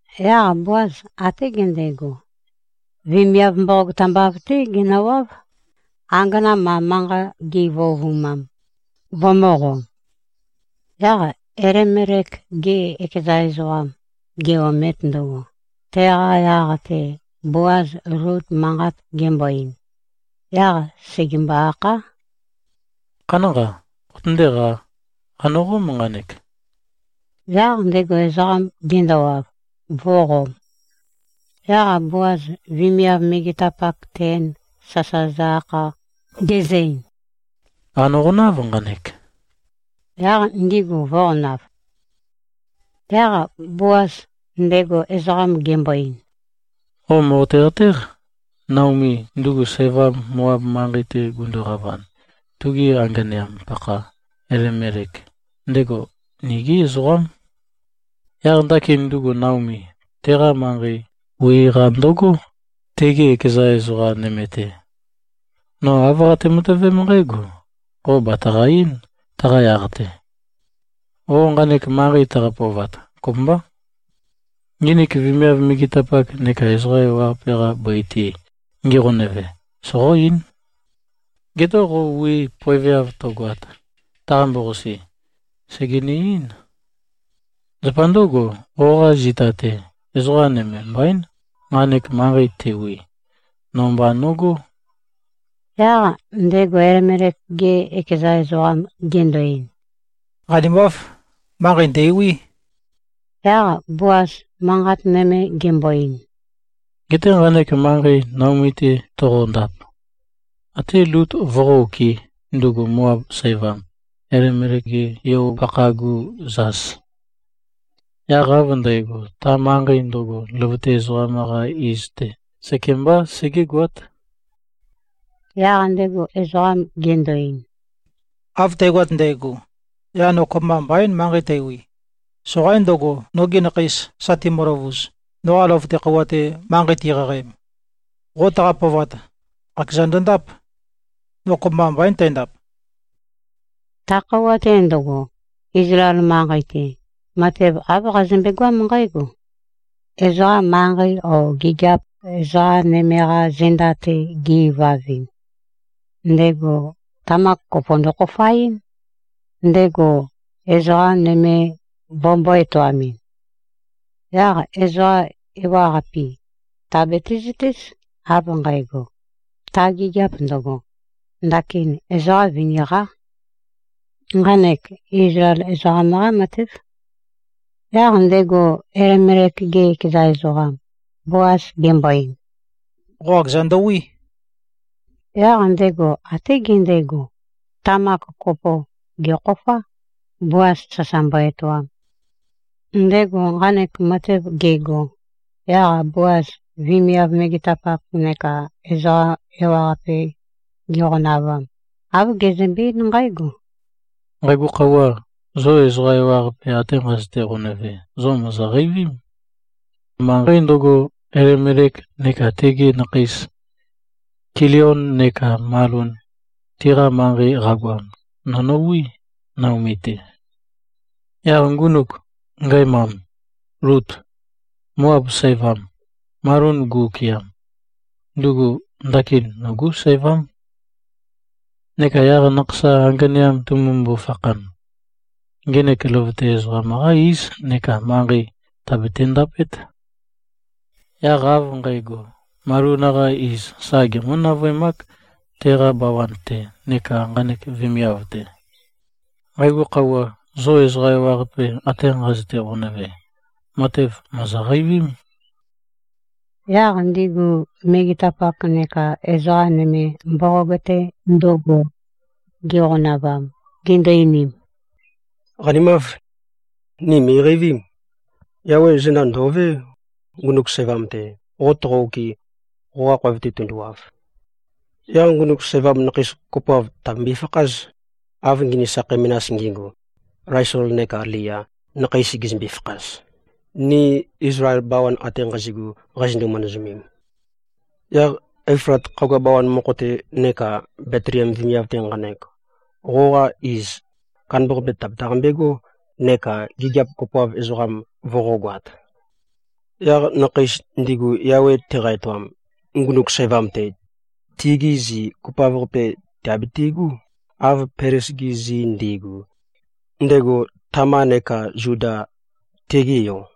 Yaq Boaz até gendego, vemiav mboqog tambav-té genøwáv, angana ma manqat gi꞉vøovumam, vømø̄qom. Yaq Elimelek-ge ekeza ezoqam ge-omet ndøgo, teqa yaq-te Boaz Lut manqat gembøe-ein, yaq sègembo-akhá, “Khanánqa. Qotøndéqā. Qànøqóm nqanek.” Yaq ndego ezoqam gendowav, vø̄qom. Yaq Boaz vemiav megetapak ten sasa zø-akha, gezø-ein, “Qànøqonáv nqanek,” yaq ndigu vø̄qonav. Yaq Boaz ndego ezoqam gembo-ein, “Qo mòqote-qatéq. Naomi, ndugu sævam, Moab manqei-te gunduqavan, tugi anganeam-pakha Elimelek, ndego nigé ezoqám. Yaq ndakin ndugu Naomi, teqa manqei wi-qa ndøgó, tege ekeza ezoqa nøme-te. No āv qate-matøvém nqǽgo, qo bàtaqa-eín, taqa yaq-te. Qo nqanek manqei taqa-pøovat, kopømbá. Nginik vemiav megetapak neka ezoqa ewaqape-qa bøi-te, ngiqonøve, soqó-eín. Geté qo wii poeveav tøgoat, taqambo-qasi, sègenø-eín. Zapa ndǿgo, qoqa zita-te ezoqa nøme mbaín, nqanek manqei tewi. No mba nogó.” Yaq ndego Elimelek-ge ekeza ezoqam gendo-ein, “Qanimáv. Manqei ndæ̀wí.” Yaq Boaz manqat nøme gembo-ein, “Geté nqanek manqei Naomi-te toqondap, até Lut voqó-okɨ̄, ndugu Moab sævam, Elimelek-ge yo-pakha-gu zas. Yaq av ndægo, ta manqei ndøgo løvøte ezoqam-qa iz-te sekembá segégoát.” Yaq ndego ezoqam gendo-ein, “Av tægoat ndægo, yaq no kopømba mbaín manqei tæwi. Soqaín ndøgo, nogi nakheis sa timøløvuz, noqa løvøte khøuwa-te manqei tiqaqaem. Qo taqa-pøovat, qakeza ndøndáp. No kopømba mbaín tændap.” Ta khøuwa-te ndøgo, Izlael manqei-te, matev āv qazømbe-goám nqǽgo. Ezoqa manqei o gigiap ezoqa nøme-qa zenda-te ge-ivavɨn, ndego tamak kopo ndøkhofaɨ́n, ndego ezoqa nøme vømbō-etoamɨn. Yaq ezoqa ewaqape tìabiti-zøtéz, av nqægo, ta gigiap ndøgo, ndakin ezoqa vini-qá. Nqanek Izlael ezoqam-qá matév. Yaq ndego Elimelek-ge ekeza ezoqam Boaz gembo-ein, “Qo qakeza ndøwí.” Yaq ndego até gendego, tamak kopo gèkhofá, Boaz sasa mbo-etoam. Ndego nqanek matev gego, yaq Boaz vemiav megetapak neka ezoqa ewaqape giqonavam, āv gezømbe-eín nqǽgo, “Nqægo khøuwa, zo ezoqa ewaqape ate nqazøte-qonøve, zo mòzoqeivím. Manqei ndøgo, Elimelek neka tegi nakheis, Kilion neka Malon, tiqa manqei qagoam, no nowí, Naomi-te. Yaq ngunuk ngæmam, Lut, Moab sævam, Malon gu-okɨam, ndugu ndakin nogú sævám. Neka yaq nakhasam anganeam tumumbu-fakhan, ngenek løvøte ezoqam-qá íz neka manqei teabete-ndapét. Yaq av nqægo, Malon-qa iz sa gemǿ-navøemák teqa bawan-te neka nqanek vemiav-te. Nqægo khøuwa zo ezoqa ewaqape ate nqazøte-qonøve, matev mòzoqeivím.” Yaq ndigu megetapak neka ezoqa nøme, mboqog-te ndøgo giqonavam, gindu-einim, “Qanimáv. Ni mø̀iqeivím. Yawe zenda ndò꞉vé, ngunuk sævam-te, qo toqo-okɨ, qoqa khoev-te tunduwav. Yaq ngunuk sævam nakheis kopoav tìabembøe-fakház, av nginik sakhei menas ngi꞉gu, Laisol neka Lea nakheis gizømbe-fakhaz, ni Izlael bawan ate nqazi꞉gu qazindu-manazømem. Yaq Eflat khagua bawan mokho-te neka Betliem vemiav-te nqanek, qoqa iz kandambaqape tàbetaqambegó neka gigiap kopoav ezoqam voqógoāt. Yaq nakheis ndigu Yawe teqa-etoam, ngunuk sævam-te, tigi zi kopoav-qape tìabitigú, av Pelez-gi zi ndi꞉gu, ndego Tama neka Zuda, tige yo.”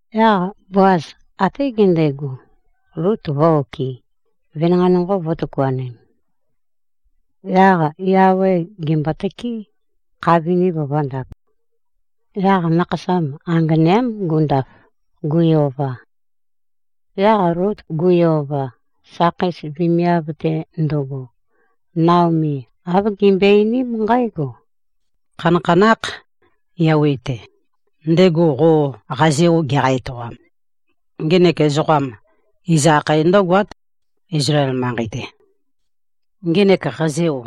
Yaq Boaz até gendego, Lut vø̄-okɨ, venanqei nonqo vø̄tøkuanem. Yaq Yawe gèmbotøké, kha viniv vø̄ndap. Yaq nakhasam anganeám gundaf, gui-ova. Yaq Lut gui-ova, sakheis vemiav-te ndøgo, Naomi āv gimbøe-einím nqǽgo, “Khanakhanákh Yawe-te, ndego qo qazeo geqa-etoam. Ngenek ezoqam iz akhae ndǿgoát, Izlael manqei-te. Ngenek qazeo,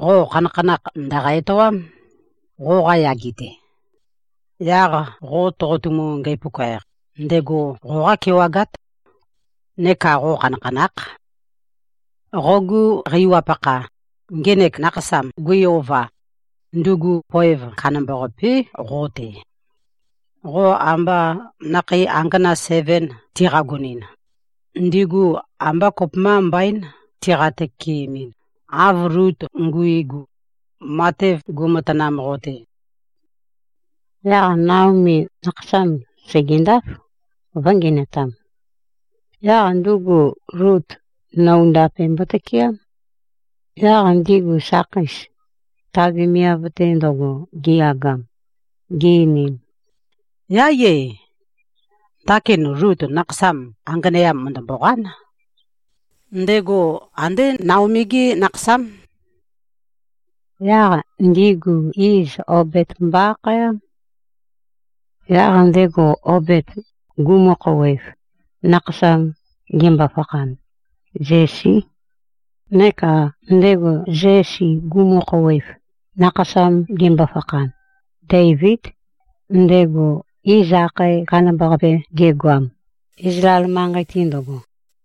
qo khanakhanakh ndø̀qa-etoám, qoqa yage-te. Yaq qo toqotumu-ngæpuka-eq, ndego qo qákewagát. Neka qo khanakhanákh. Qogu qæwap-pakha, ngenek nakhasam gui-ova, ndugu poev kandambá qo-te. Qo amba nakhei angana seven tiqagonɨn, ndigu ambá kopømba mbaín tiqa-tøkeemɨn, av Lut nguigu, matev guimatanam qo-te.” Yaq Naomi nakhasam sègendáf, vø̄ngenøtam. Yaq ndugu Lut noundape mbotøkeám. Yaq ndigu sakheis, ta vemiav-te ndøgo giyagam, gi-einim, “Yáiyé! Ndakin Lut nakhasam anganeam mø̀ndømboqán. Ndego andé Naomi-gé nakhasám.” Yaq ndigu iz Obed mbo-akhaém. Yaq ndego Obed gumu-khouwev, nakhasam gembo-fakhan, Zesí. Neka ndego Zesi gumu-khouwev, nakhasam gembo-fakhan, Deivíd, ndego iz akhae kandambaqape gegoam, Izlael manqei-te ndøgo.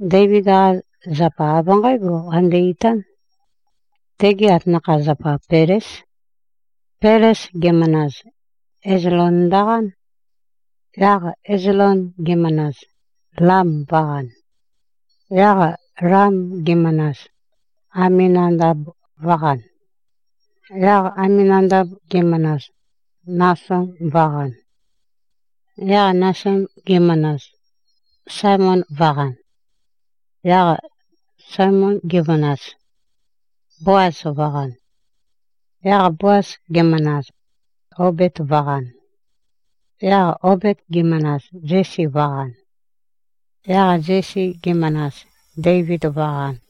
Deivid-qa zapa av nqǽgo qande-itán: Tege atanakha-zapa Peléz. Pelez gemanaz, Ezlon ndøqán. Yaq Ezlon gemanaz, Lam vø̄qan. Yaq Lam gemanaz, Aminadab vø̄qan. Yaq Aminadab gemanaz, Nason vø̄qan. Yaq Nason gemanaz, Salmon vø̄qan. Yaq Salmon gemanaz, Boaz vø̄qan. Yaq Boaz gemanaz, Obed vø̄qan. Yaq Obed gemanaz, Zesi vø̄qan. Yaq Zesi gemanaz, Deivid vø̄qan.